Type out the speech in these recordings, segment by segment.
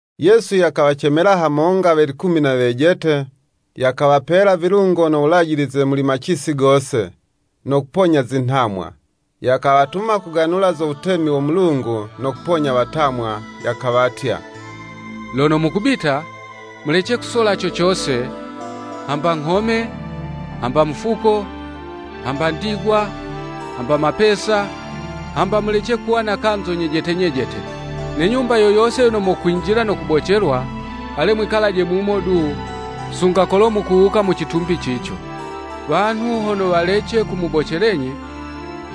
Yesu yakawacemela hamonga we likumi na wejete, yakawapela vilungo no wulajilize muli macisi gose, no kuponya zinhamwa. Yakawatuma kuganula zo wutemi wo Mulungu, no kuponya watamwa. Yakawatya, “Lono mukubita, mulece kusola cocose, hamba nghome, hamba mufuko, hamba ndigwa, hamba mapesa, hamba mulece kuwa na kanzo nyejete nyejete. Ne nyumba yo yose yono mokwinjila no kubocelwa, ale mwikalaje mumo du, sunga kolo mukuwuka mu citumbi cico. Wanhu hono walece kumubocelenyi,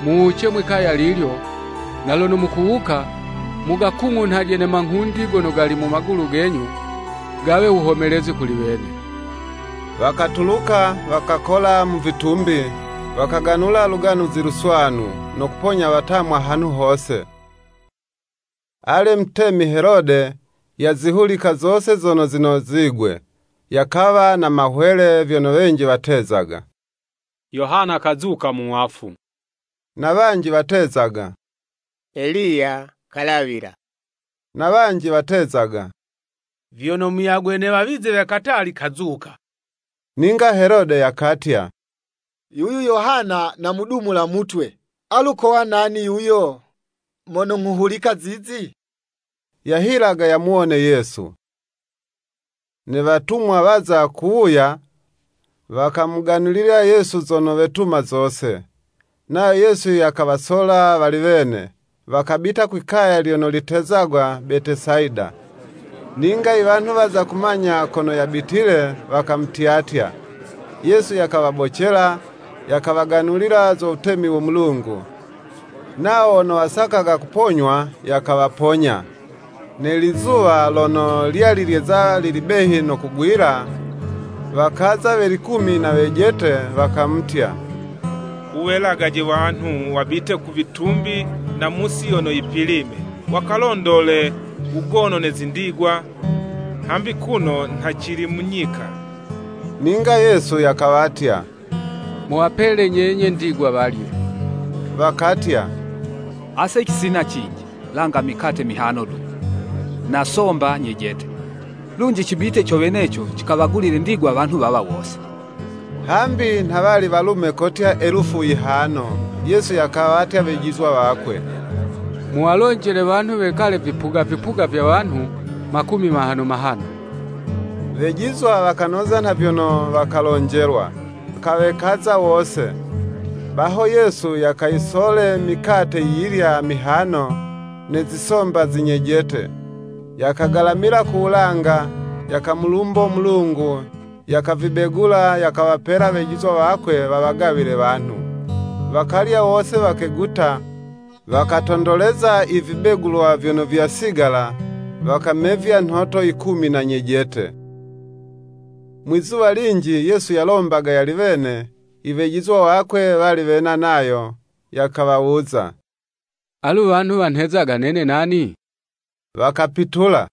muwuce mwi'kaya lilyo, na lono mukuwuka, mugakung'unhaje manghundi gono gali mu magulu genyu, gawe wuhomelezi kuli wene.” Wakatuluka, wakakola mu vitumbi, wakaganula Luganuzi Luswanu, no kuponya watamwa hanhu hose. Ale, Mutemi Helode, yazihulika zose zono zinozigwe; yakawa na mahwele, vyono wanji watezaga, Yohana kazuka mu wafu, na wanji watezaga, Eliya kalawila, na wanji watezaga, vyono muyagwe ne wawizi we katali kazuka. Ninga Helode yakatya, “Yuyu Yohana namudumula mutwe; alu kowa nani yuyo, mono nghuhulika zizi?” Yahilaga yamuwone Yesu. Ne watumwa waza kuwuya, wakamuganulila Yesu zono wetuma zose. Nayo Yesu yakawasola wali wene, wakabita kwi'kaya lyono litezagwa Betesayida. Ninga i wanhu waza kumanya kono yabitile, wakamutyatya: Yesu yakawabocela, yakawaganulila zo wutemi wo Mulungu, nawo wono wasakaga kuponywa, yakawaponya. Ne lizuwa lono lyali lyeza lili behi no kugwila, wakaza we likumi na wejete, wakamutya, “Wuwelagaje wanhu wabite ku vitumbi na mu'si yono yipilime, wakalondole wugono ne zindigwa; hambi kuno nha cili mu nyika.” Ninga Yesu yakawatya, “Muwapele nyenye ndigwa walye.” Wakatya, “Ase cisina cinji, langa mikate mihano du na somba nyejete, lunji cibite co weneco cikawagulile ndigwa wanhu wawa wose!” (Hambi nha wali walume kotya elufu yihano). Yesu yakawatya wejizwa wakwe, “Muwalonjele wanhu wekale vipuga vipuga vya wanhu makumi mahano mahano.” Wejizwa wakanoza nha vyono wakalonjelwa, wakawekaza wose. Baho Yesu yakayisole mikate yiyilya mihano, ne zisomba zinyejete, yakagalamila ku wulanga, yakamulumbo Mulungu, yakavibegula, yakawapela wejizwa wakwe wawagawile wanhu. Wakalya wose wakeguta; wakatondoleza i vibegulwa vyono vyasigala, wakamevya nhoto yikumi na nyejete. Mwizuwa linji Yesu yalombaga yali wene, i Wejizwa wakwe wali wena nayo. Yakawawuza, “Alu wanhu wanhezaga nene nani?” Wakapitula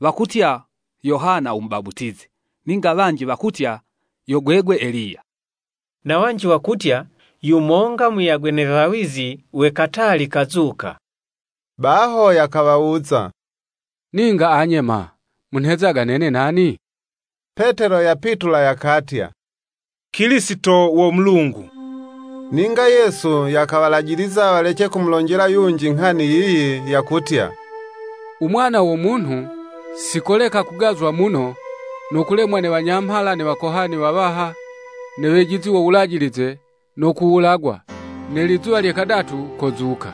“Wakutya, Yohana u Mubaputizi, ninga wanji wakutya, yo gwegwe Eliya, na wanji wakutya, yumonga muyagwe ne wawizi we katali kazuka.” Baho yakawawuza, “Ninga anye ma, munhezaga nene nani?” Petelo yapitula yakatya, “Kilisito wo Mulungu.” Ninga Yesu yakawalajiliza walece kumulonjela yunji nghani yiyi, yakutya, “U Mwana wo Munhu, si koleka kugazwa muno no kulemwa ne wanyamhala ne wakohani wawaha, ne wejizi wo Wulajilize, no kuwulagwa, ne lizuwa lye kadatu kozuka.”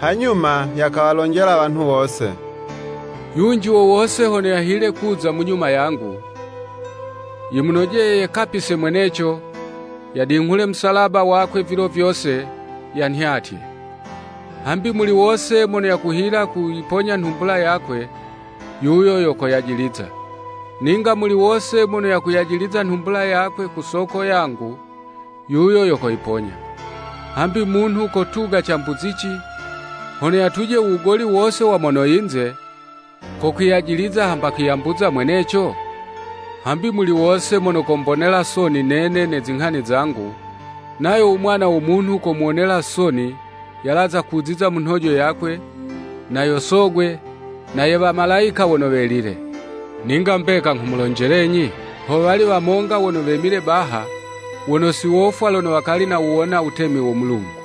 Hanyuma yakawalonjela wanhu wose, “Yunji wowose hono yahile kuza munyuma yangu, yimunojeye yekapise mweneco, yadinghule musalaba wakwe vilo vyose, yanhyatye. Hambi muli wose mono yakuhila kuyiponya nhumbula yakwe, yuyo yo koyajiliza; ninga muli wose mono koyajiliza nhumbula yakwe kusoko yangu, yuyo yo koyiponya. Hambi munhu kotuga cambuzici, hono yatuje u wugoli wose wa mono yinze, ko kwiyajiliza hamba kwiyambuza mweneco? Hambi muli wose mono kombonela soni nene ne zinghani zangu, nayo u Mwana wo Munhu kolomuwonela soni, yalaza kuziza mu nhojo yakwe, na yo Sogwe, na ye Wamalayika wono welile. Ninga mbeka nghumulonjelenyi, howali wamonga wono wemile baha, wono si wofwa lono wakali si nawuwona wutemi wo Mulungu.”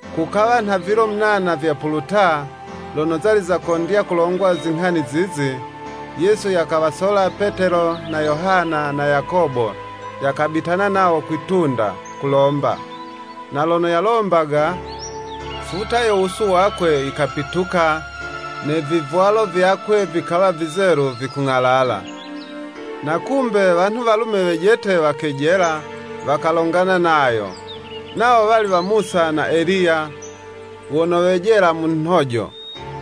Kukawa nha vilo munana vyapuluta, lono zali zakondya kulongwa zinghani zizi, Yesu yakawasola Petelo na Yohana na Yakobo, yakabitana nawo kwi'tunda, kulomba. Na lono yalombaga, futa yo wusu wakwe yikapitula, ne vivwalo vyakwe vikawa vizelu, vikung'alala. Na kumbe, wanhu walume wejete wakejela, wakalongana nayo, nawo wali wa Musa na Eliya, wono wejela mu nhojo,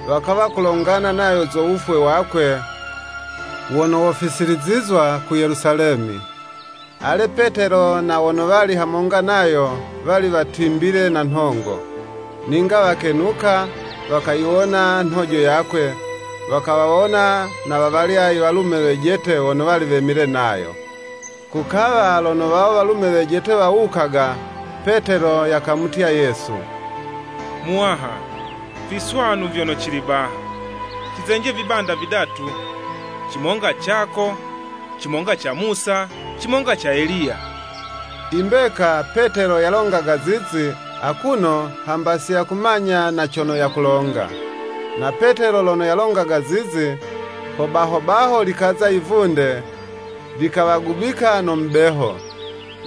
wakawa kulongana nayo zo wufwe wakwe wono wofisilizizwa ku Yelusalemi. Ale, Petelo, na wono wali hamonga nayo wali watimbile na nhongo, ninga wakenuka, wakayiwona nhojo yakwe, wakawawona na wawalya iwalume wejete wono wali wemile nayo. Kukawa lono wawo walume wejete wawukaga, Petelo yakamutya Yesu, “Muwaha, viswanu vyono cili baha, cizenje vibanda vidatu; cimonga cako, cimonga ca Musa, cimonga ca Eliya.” I mbeka, Petelo yalongaga zizi, akuno hamba siyakumanya na cono yakulonga. Na Petelo lono yalongaga zizi, ho baho baho likaza yivunde, likawagubika no mubeho: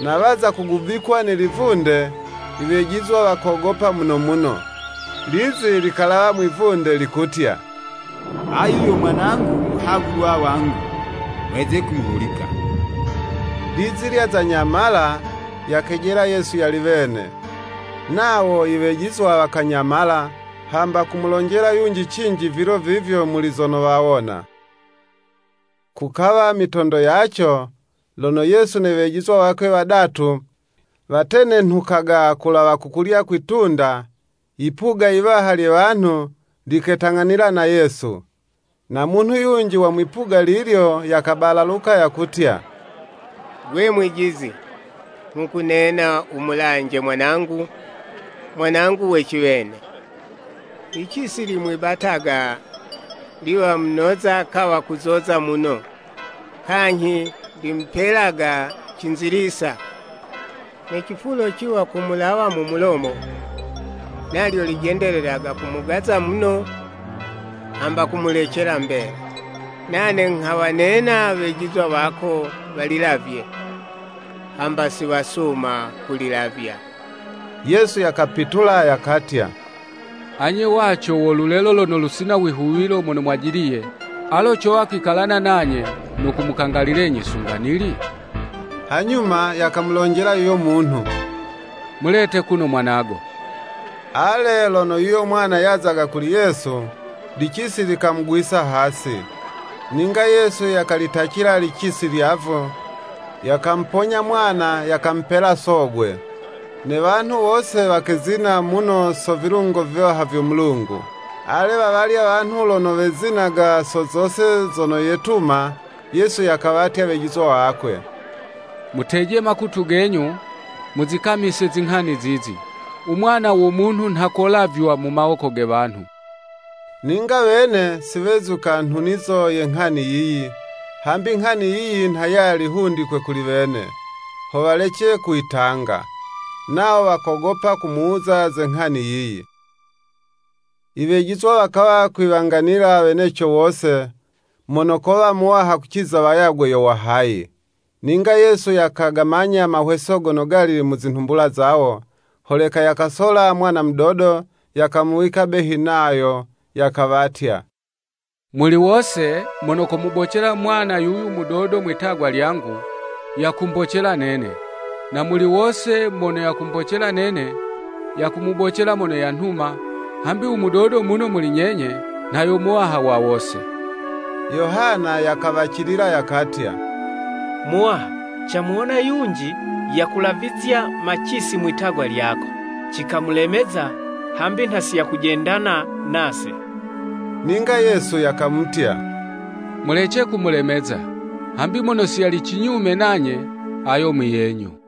na waza kugubikwa ne livunde, i wejizwa wakogopa muno muno. Lizi likalawa mwivunde, likutya, “Ayu yo Mwanangu muhagulwa wangu: mweze kumuhulika.” Lizi lyaza nyamala, yakejela Yesu yali wene. Nawo i wejizwa wakanyamala, hamba kumulonjela yunji cinji vilo vivyo muli zono wawona. Kukawa mitondo yaco, lono Yesu ne wejizwa wakwe wadatu, watenenhukaga kulawa ku kulya kwi'tunda, yipuga yiwaha lye wanhu liketang'anila na Yesu. Na munhu yunji wa mwipuga lilyo, yakabalaluka yakutya, “Gwe Mwijizi, nghukunena wumulanje mwanangu, mwanangu we ciwene. Licisi limwibataga liwa munoza kawa kuzoza muno, kanyhi limupelaga cinzilisa, ne cifulo ciwa kumulawa mu mulomo. Nalyo lijendelelaga kumugaza muno, hamba kumulecela mbela. Nane nghawanena wejizwa wako walilavye; hamba siwasuma kulilavya.” Yesu yakapitula yakatya, “Anye waco mo lulelo lono lusina wihuwilo mono mwajiliye, alo cowa kwikalana nanye, no kumukangalilenyi sunga nili?” Hanyuma yakamulonjela yuyo munhu, “Mulete kuno mwanago.” Ale, lono yuyo mwana yazaga kuli Yesu, licisi likamugwisa hasi. Ninga Yesu yakalitacila licisi lyavu, yakamuponya mwana, yakamupela sogwe. Ne wanhu wose wakezina muno so vilungo viwaha vyo Mulungu. Ale, wawalya wanhu lono wezinaga so zose zono yetuma, Yesu yakawatya wejizwa wakwe, Muteje makutu genyu, muzikamise zinghani zizi: “U Mwana wo Munhu nha kolavywa mu mawoko ge wanhu.” Ninga wene si wezuka nhunizo ye nghani yiyi, hambi nghani yiyi nha yali hundikwe kuli wene, ho walece kuyitanga; nawo wakogopa kumuwuza ze nghani yiyi. I wejizwa wakawa kwiwanganila weneco wose, mono kowa muwaha kuciza wayagwe yo wa hayi. Ninga Yesu yakagamanya mahweso gono gali mu zinhumbula zawo, holeka yakasola mwana mudodo, yakamuwika behi nayo, Yakawatya. “Muli wose, mono komubocela mwana yuyu mudodo mwi'tagwa lyangu, yakumbocela nene: na muli wose mono yakumbocela nene, yakumubocela mono yanhuma, hambi u mudodo muno muli nyenye, nha yo muwaha wa wose.” Yohana yakawacilila yakatya, “Muwaha, camuwona yunji yakulavizya macisi mwi'tagwa lyako; cikamulemeza, hambi nha si yakujendana na'se.” Ninga Yesu yakamutya, “Mulece kumulemeza: hambi mono si yali cinyume nanye, ayo muyenyu.”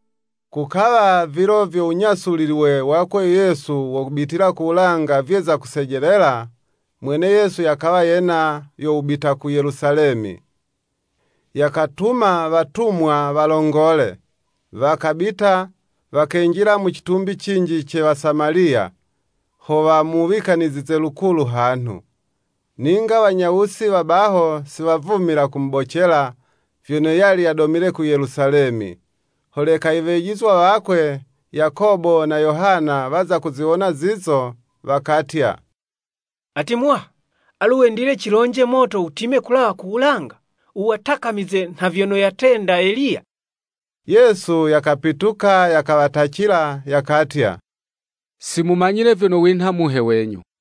Kukawa, vilo vyo wunyasulilwe wakwe Yesu wo kubitila ku wulanga vyeza kusejelela, mwene Yesu yakawa yena yo wubita ku Yelusalemi. Yakatuma watumwa walongole; wakabita, wakenjila mu citumbi cinji ce Wasamaliya, ho wamuwikanizize lukulu hanhu. Ninga wanyawusi wa baho siwavumila kumubocela, vyono yali yadomile ku Yelusalemi. Holeka i wejizwa wakwe, Yakobo na Yohana waza kuziwona zizo, wakatya. “Ati Muwaha, alu wendile cilonje moto wutime kulawa ku wulanga, wuwatakamize, [nha vyono yatenda Eliya]?” Yesu yakapituka yakawatacila. [Yakatya, “Si mumanyile vyono winha muhe wenyu.”]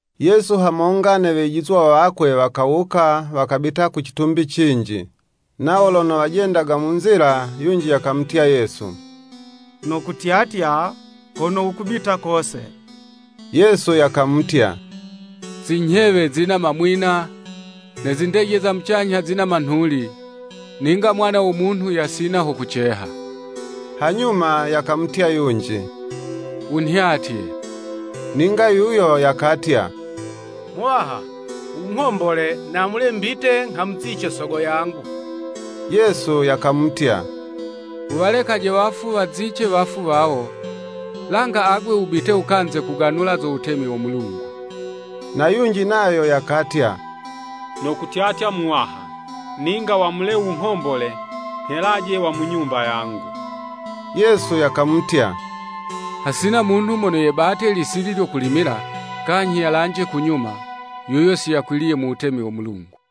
Yesu hamonga ne wejizwa wakwe wakawuka wakabita ku citumbi cinji. Nawo lono wajendaga mu nzila, yunji yakamutya Yesu, “Nokutyatya kono wukubita kose.” Yesu yakamutya, “Zinyhewe zina mamwina, ne zindeje za mucanyha zina manhuli, ninga Mwana wo Munhu yasina ho kuceha.” Hanyuma, yakamutya yunji, “Wunhyatye.” Ninga yuyo yakatya, “Muwaha, wunghombole namule mbite nghamuzice sogo yangu.” Yesu yakamutya, “Wuwalekaje wafu wazice wafu wawo; langa agwe wubite wukanze kuganula zo wutemi wo Mulungu.” Na yunji nayo yakatya, “Nokutyatya Muwaha; ninga wamule wunghombole nghelaje wa mu nyumba yangu.” Yesu yakamutya, hasina munhu mono yebate lisili lyo kulimila, kanyhi yalanje kunyuma, yuyo si yakwiliye mu wutemi wo Mulungu!